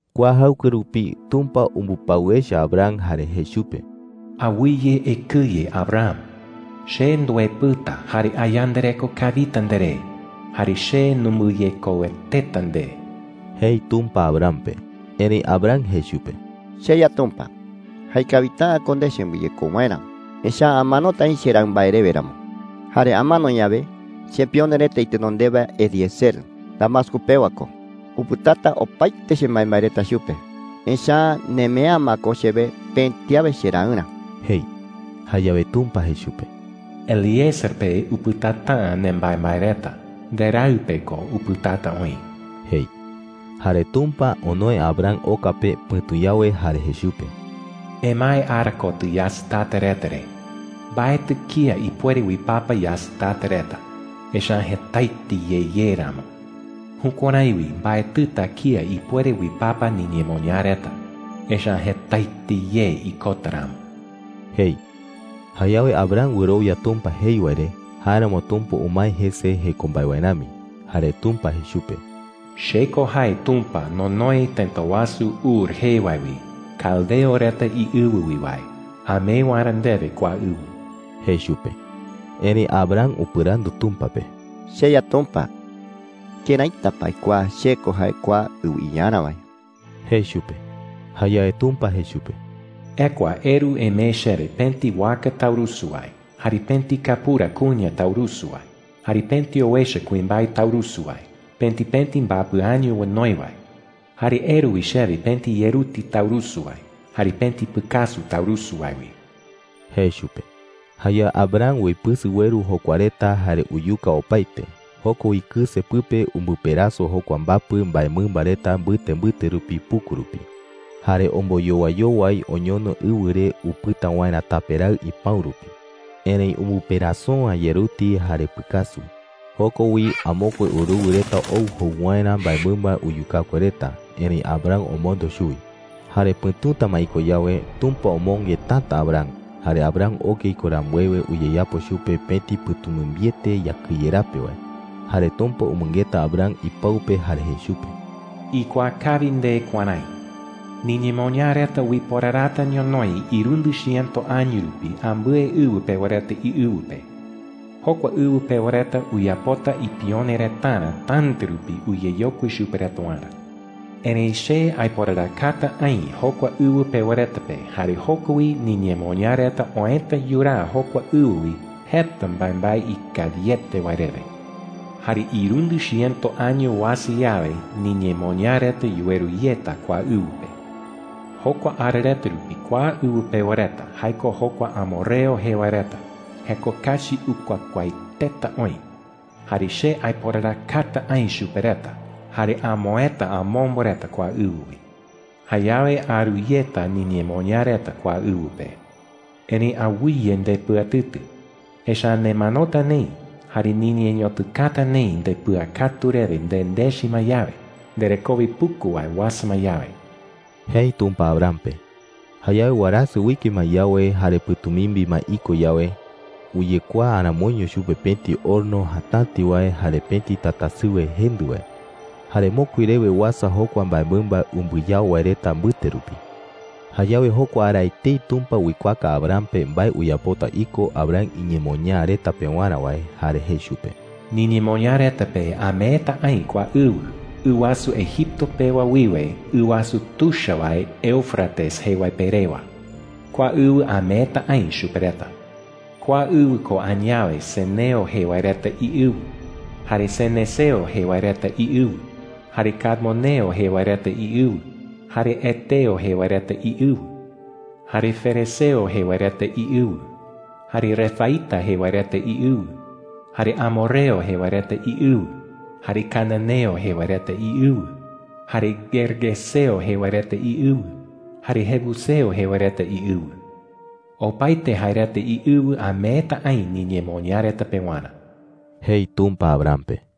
Kua jaɨkue rupi, Tumpa umbɨpau echa Abram jare jei chupe: “Awɨye ekɨye, Abram. Che nduepɨta, jare ayandareko kawita nderé. Jare che numbɨyekoueteta nde,” jei Tumpa Abram pe. Erëi Abram jei chupe: “CheYa Tumpa, jaekawita’ä ko nde chembɨyekou waerä, echa’ä amanota aï cheraɨ mbae rewe ramo. Jare amano yawe, chepione reta itenondewa Eliezer – Damasco pewa ko – upɨtata opaete chembaembae reta chupe, echa’ä nemee’ä ma ko chewe pëti awe cheraɨrä,” jei. Jayawe Tumpa jei chupe: “Eliezer pe upɨtata’ä nembaembae reta. Nderaɨ pe ko upɨtata oï,” jei. Jare Tumpa onoe Abram oka pe pɨ̈tu yawe jare jei chupe: “Emae ara kotɨ yasɨtata reta re. Mbaetɨ kía ipuere uipapa yasɨtata reta, echa’ä jetaete ye ye ramo. Jukuärái wi mbaetɨta kía ipuere uipapa niñemoñaa reta, echa’ä jetaete ye ikota ramo,” jei. Jayawe Abram wɨrowia Tumpa jei wae re; jáeramo Tumpa umae jese jeko mbae wae rami. Jare Tumpa jei chupe: “Che ko jae Tumpa nonoe tëta wasu Ur jee wae wi, caldeo reta iɨwɨ wi wae, amee waerä ndewe kua ɨwɨ,” jei chupe. Erëi Abram upɨrandu Tumpa pe: “CheYa Tumpa, ¿këraita pa aikuaa che ko jae kua ɨwɨ iyarä wae?” jei chupe. Jayawe Tumpa jei chupe: “Ekua eru emee chewe pëti waka taurusu wae, jare pëti kapura kuña taurusu wae, jare pëti owecha kuimbae taurusu wae, pëti pëti mbapɨ año onoi wae. Jare eru wi chewe pëti yeruti taurusu wae, jare pëti pɨkasu taurusu wae wi,” jei chupe. Jayawe Abram uipɨsɨ ueru jokua reta jare uyuka opaete. Joko wi kɨse pɨpe umbɨperaso jokua mbapɨ mbaemɨmba reta mbɨte mbɨte rupi puku rupi. Jare omboyowaiyowai oñono ɨwɨ re upɨta waerä tape raɨ ipäu rupi. Erëi umbɨperaso’ä yeruti jare pɨkasu. Joko wi amokue uruwɨ reta ou jou waerä mbaemɨmba uyukakue reta, erëi Abram omondo chuwi. Jare pɨ̈tuta ma iko yawe, Tumpa omonge täta Abram. Jare Abram oke iko rambuewe, uyeyapo chupe pëti pɨ̈tumimbiete yakɨye rape wae. Jare Tumpa umɨngeta Abram ipau pe jare jei chupe: “Ikuaa kawi nde kuärái: Niñemoñaa reta uiporarata ñonoï irundɨ chiëto año rupi ambɨe ɨwɨ pewa reta iɨwɨ pe. Jokua ɨwɨ pewa reta uyapota ipione retarä täta rupi uyeyokui chupe reta waerä,” jei. “Erëi che aiporarakata aï jokua ɨwɨ pewa reta pe, jare joko wi niñemoñaa reta oëta yuraa jokua ɨwɨ wi jeta mbaembae ikawiete wae rewe,” jei. “Jare irundɨ chiëto año uasa yawe, niñemoñaa reta yuweru yeta kua ɨwɨ pe,” jei. “Jokua ara rupi kua ɨwɨ pewa reta – jae ko jokua amorreo jee wae reta – jeko kachi ukuakuaaeteta oï. Jare che aiporarakata aï chupe reta jare amoëta amombo reta kua ɨwɨ wi,” jei. “Jayawe aru yeta niñemoñaa reta kua ɨwɨ pe,” jei. “Erëi awɨye ndepɨatɨtɨ, echa’ä nemanota neï jare niñeñotɨkata neï ndepɨakatu rewe nendechi ma yawe, nderekowe puku wae uasa ma yawe,” jei Tumpa Abram pe. Jayawe warasɨ uike ma yawe jare pɨ̈tumimbi ma iko yawe, uyekuaa aramoiño chupe pëti horno jatäti wae jare pëti tatasɨwe jendɨ wae. Jare mokui rewe uasa jokua mbaemɨmba umbɨyao wae reta mbɨte rupi. Jayawe jokua ara etei Tumpa uikuaaka Abram pe mbae uyapota iko Abram iñemoñaa reta pewarä wae, jare jei chupe: “Niñemoñaa reta pe ameeta aï kua ɨwɨ, ɨ wasu Egipto pewa wiwe ɨ wasu tuicha wae Éufrates jee wae pe rewa. Kua ɨwɨ ameeta aï chupe reta,” jei chupe. “Kua ɨwɨ ko añawe ceneo jee wae reta iɨwɨ, jare cenezeo jee wae reta iɨwɨ, jare cadmoneo jee wae reta iɨwɨ, jare heteo jee wae reta iɨwɨ, jare ferezeo jee wae reta iɨwɨ, jare refaíta jee wae reta iɨwɨ, jare amorreo jee wae reta iɨwɨ, jare cananeo jee wae reta iɨwɨ, jare gergeseo jee wae reta iɨwɨ, jare jebuseo jee wae reta iɨwɨ. Opaete jae reta iɨwɨ ameeta aï niñemoñaa reta pewarä,” jei Tumpa Abram pe.